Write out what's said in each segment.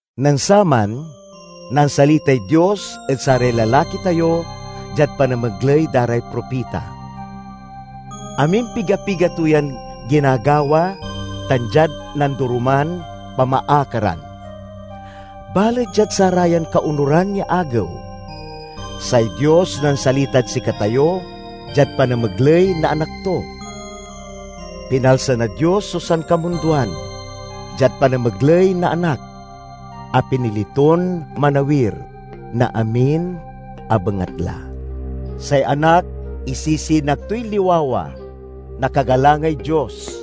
Nen saman, nansalitay Dios ed saray lalaki tayo diad panamegley da ray propita. Amimpiga-piga to yan ginagawa, tan diad nandoroman pamaakaran. Balet diad sarayan kaonuran ya agew, say Dios nansalitad sikatayo diad panamegley na Anak to. Pinalsa na Dios so sankamundoan diad panamegley na Anak, a pinili ton manawir na amin a bengatla. Say Anak isisinag toy liwawa na kagalangay Dios,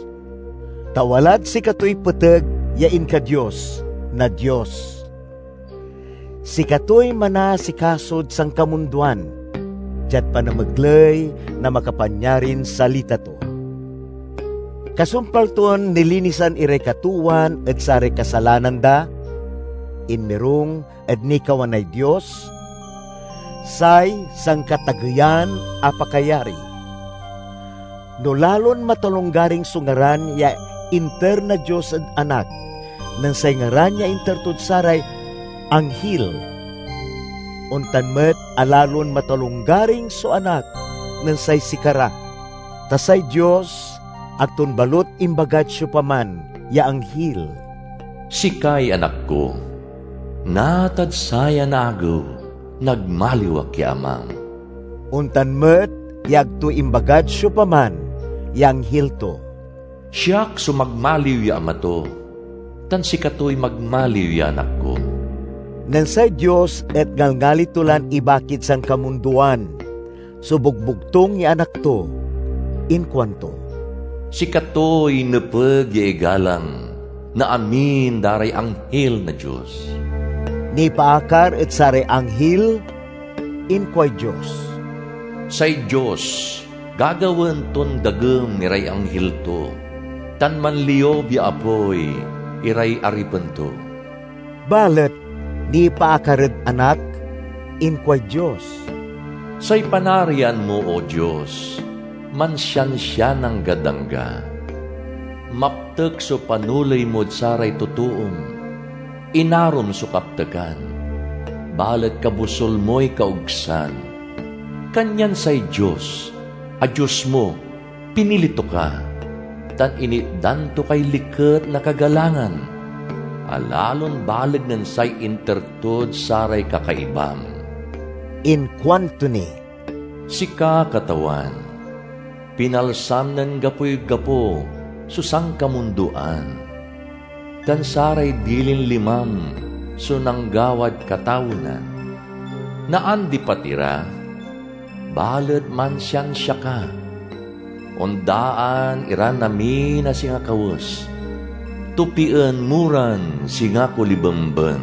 ta walad sikatoy peteg ya inka-Dios na Dios. Sikatoy manaasikasod sankamundoan diad panamegley na makapanyarin salita to. Kasumpal ton nilinisan iray katoowan ed saray kasalanan da, inmirung ed nikawanay Dios, say Sankatageyan a Pakayari. No lalon matalonggaring so ngaran ya inter na Dios ed Anak nen say ngaran ya inter tod saray anghil, ontan met a lalon matalonggaring so Anak nen say sikara. Ta say Dios ag ton balut imbagad siopaman ya anghil, "Sikay Anak ko; natad sayan agew, nagmaliw ak ya Amam." Ontan met ya ag to imbagad siopaman ya anghil to, "Siak so magmaliw ya Ama to, tan sikatoy magmaliw ya Anak ko." Nen say Dios et ngalngali to lan ibakid sankamundoan so bogbogtung ya Anak to, inkuanto, "Sikatoy nepeg ya igalang na amin da ray anghil na Dios." Nipaakar ed saray anghil, inkuay Dios, "Say Dios gagawaen ton dagem iray anghil to, tan manliub ya apoy iray aripen to." Balet nipaakar ed Anak, inkuay Dios: "Say panarian mo, O Dios, mansiansian anggad angga! Maptek so panoley mod saray totoom. Inarom so kaptekan, balet kabosul moy kaogsan; kanyan say Dios a Dios mo pinili to ka, tan initdan to kay liket na kagalangan, a lalon baleg nen say inter tod saray kakaibam." Inkuanto ni, "Sika, Katawan, pinalsam nen gapoy gapo so sankamundoan, tan saray dilin limam so nanggawad katawenan. Naandipat ira, balet mansiansia ka, ondaan iran amin a singa kawes. Topien mo ran singa kolibemben,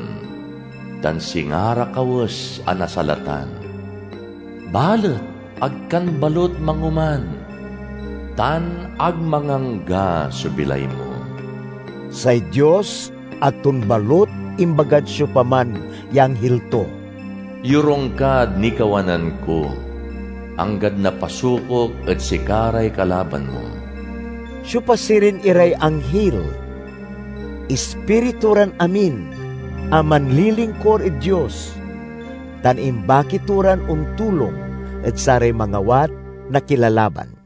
tan singa ra kawes a nasalatan, Balet ag kan balut mangoman, tan ag mangangga so bilay mo." Say Dios ag ton balut imbagad siopaman ya anghil to: "Yorung kad nikawanan ko, anggad napasukok ed sika ray kalaban mo." Siopa sirin iray anghil? Ispiritu ran amin a manlilingkur ed Dios, tan imbaki to ran ontulong ed saray mangawat na kilalaban.